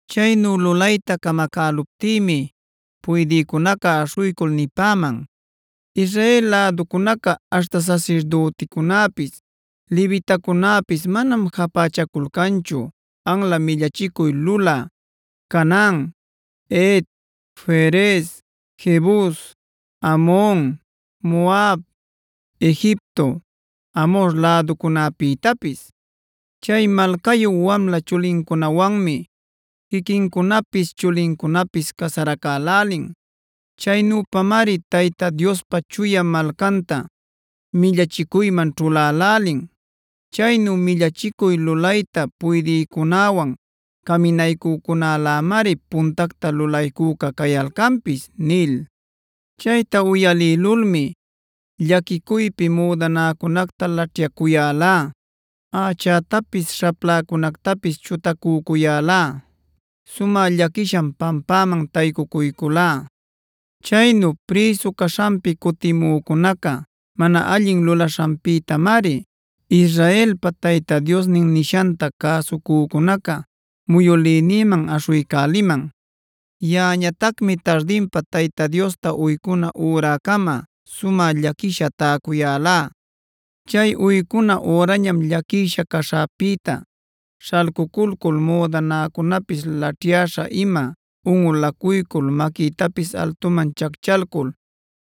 Chaynu lulayta camacäluptïmi puydïcunaca aśhuycul nipäman: “Israel läducunaca aśhta sasirdüticunäpis, levitacunäpis manam japächaculcanchu anla millachicuy lulä Canaan, Het, Ferez, Jebus, Amon, Moab, Egipto, Amhor läducunäpïtapis. Chay malcayu wamla chulincunawanmi quiquincunapis chulincunapis casaracälälin. Chaynüpamari Tayta Diospa chuya malcanta millachicuyman ćhulälälin. Chaynu millachicuy lulayta puydïcunäwan caminaycücunälämari puntacta lulaycüca cayalcanpis” nil. Chayta uyalïlulmi llaquicuypi müdanäcunacta laćhyacuyälá, ächätapis śhapläcunactapis chutacücuyälá. Sumä llaquisham pampäman taycucuyculá. Chaynu prïsu caśhanpi cutimücunaca mana allin lulaśhanpïtamari, Israelpa Tayta Diosnin nishanta cäsucücunaca muyülïnïman aśhuycäliman. Yaꞌañatacmi tardinpa Tayta Diosta uycuna üracama sumä llaquisha täcuyälá. Chay uycuna ürañam llaquisha caśhäpïta śhalcuculcul müdanäcunapis laćhyäśha-ima unꞌulacuycul maquïtapis altuman chacchalcul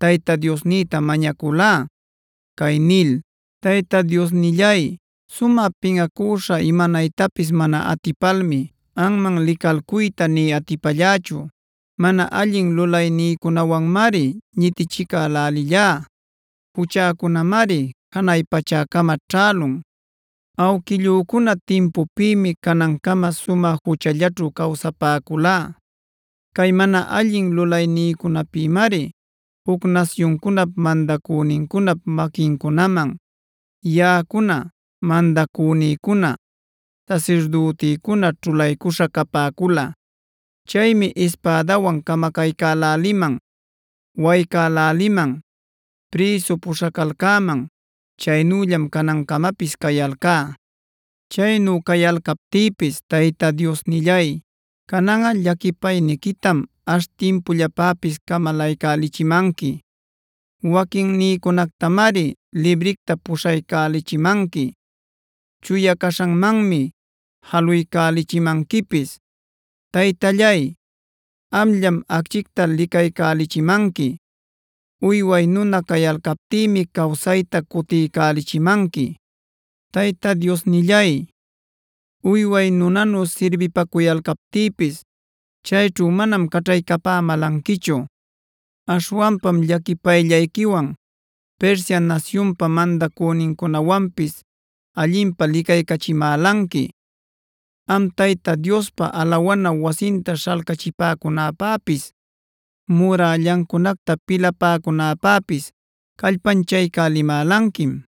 Tayta Diosnïta mañaculá, cay nil: “Tayta Diosnillay, sumä pinꞌacüśha imanaytapis mana atipalmi anman licalcuyta nï atipallächu. Mana allin lulaynïcunawanmari ñitichicälälillá; juchäcunamari janay pachäcama ćhälun. Awquillücuna timpupïmi canancama sumä juchallaćhu cawsapäculá. Cay mana allin lulaynïcunapïmari juc nasyuncunap mandacünincunap maquincunaman yaꞌacuna, mandacünïcuna, sasirdütïcuna ćhulaycuśha capäculá. Chaymi ispädawan camacaycäläliman, waycäläliman, prïsu puśhacalcäman. Chaynüllam canancamapis cayalcá. Chaynu cayalcaptïpis Tayta Diosnillay, cananꞌa llaquipayniquitam ash timpullapäpis camalaycälichimanqui. Waquinnïcunactamari libricta puchuycälichimanqui; chuya caśhanmanmi jaluycälichimanquipis. Taytallay, amllam acchicta licaycälichimanqui. Uyway nuna cayalcaptïmi cawsayta cutiycälichimanqui. Tayta Diosnillay, uyway nunanu sirbipacuyalcaptïpis chayćhu manam caćhaycapämälanquichu. Aśhwanpam llaquipayllayquiwan Persia nasyunpa mandacünincunawanpis allinpä licaycachimälanqui. Am Tayta Diospa alawana wasinta śhalcachipäcunäpäpis, murällancunacta pilapäcunäpäpis callpanchaycälimälanquim.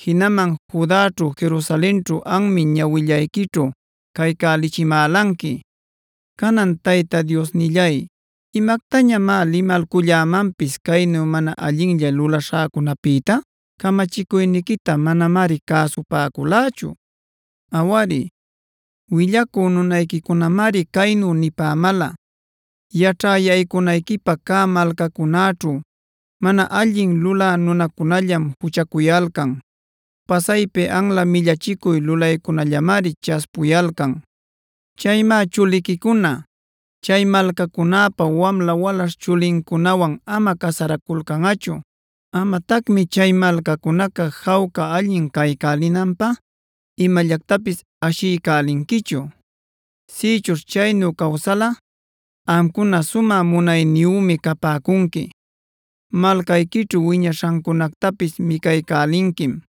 Jinaman Judaćhu Jerusalenćhu anmi ñawillayquićhu caycälichimälanqui. Canan Tayta Diosnillay, ¿imactañamá limalcullämanpis caynu mana allinlla lulaśhäcunapïta? Camachicuyniquita manamari cäsupäculächu. Awari, willacü nunayquicunamari caynu nipämäla: ‘Yaćhä yaycunayquipä cä malcacunäćhu mana allin lulä nunacunallam juchacuyalcan. Pasaypi anla millachicuy lulaycunallamari chaspuyalcan. Chaymá chuliquicuna chay malcacunäpa wamla walaśh chulincunawan ama casaraculcanꞌachu. Amatacmi chay malcacunaca jawca allin caycälinanpä imallactapis ashiycälinquichu. Sïchuśh chaynu cawsalꞌa amcuna sumä munayniyümi capäcunqui. Malcayquićhu wiñaśhancunactapis micaycälinquim;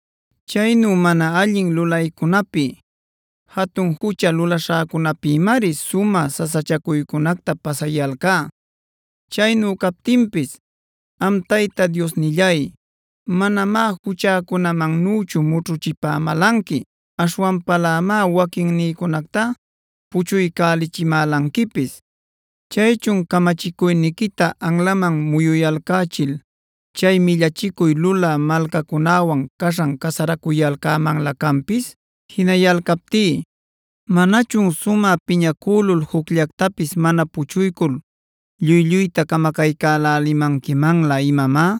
Chaynu mana allin lulaynïcunapi, jatun jucha lulaśhäcunapïmari sumä sasachacuycunacta pasayalcá. Chaynu captinpis am Tayta Diosnillay, manamá juchäcunamannüchu mućhuchipämälanqui. Aśhwanpalämá waquinnïcunacta puchuycälichimälanquipis. Chaychun ¿¡camachicuyniquita anlaman muyulcachil chay millachicuy lulä malcacunäwan caśhan casaracuyalcämanlä canpis!? Jinayalcaptí, ¿¡manachun sumä piñacülul jucllactapis mana puchuycul lluy-lluyta camacaycälälimanquimanlä imamá!?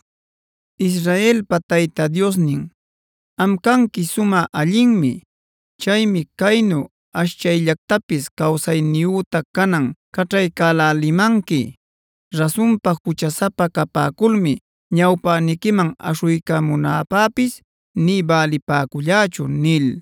Israelpa Tayta Diosnin, am canqui sumä allinmi. Chaymi caynu ashchayllactapis cawsayniyüta canan caćhaycälälimanqui. Rasunpa juchasapa capäculmi ñawpäniquiman aśhuycamunäpäpis nï bälipäcullächu” nil.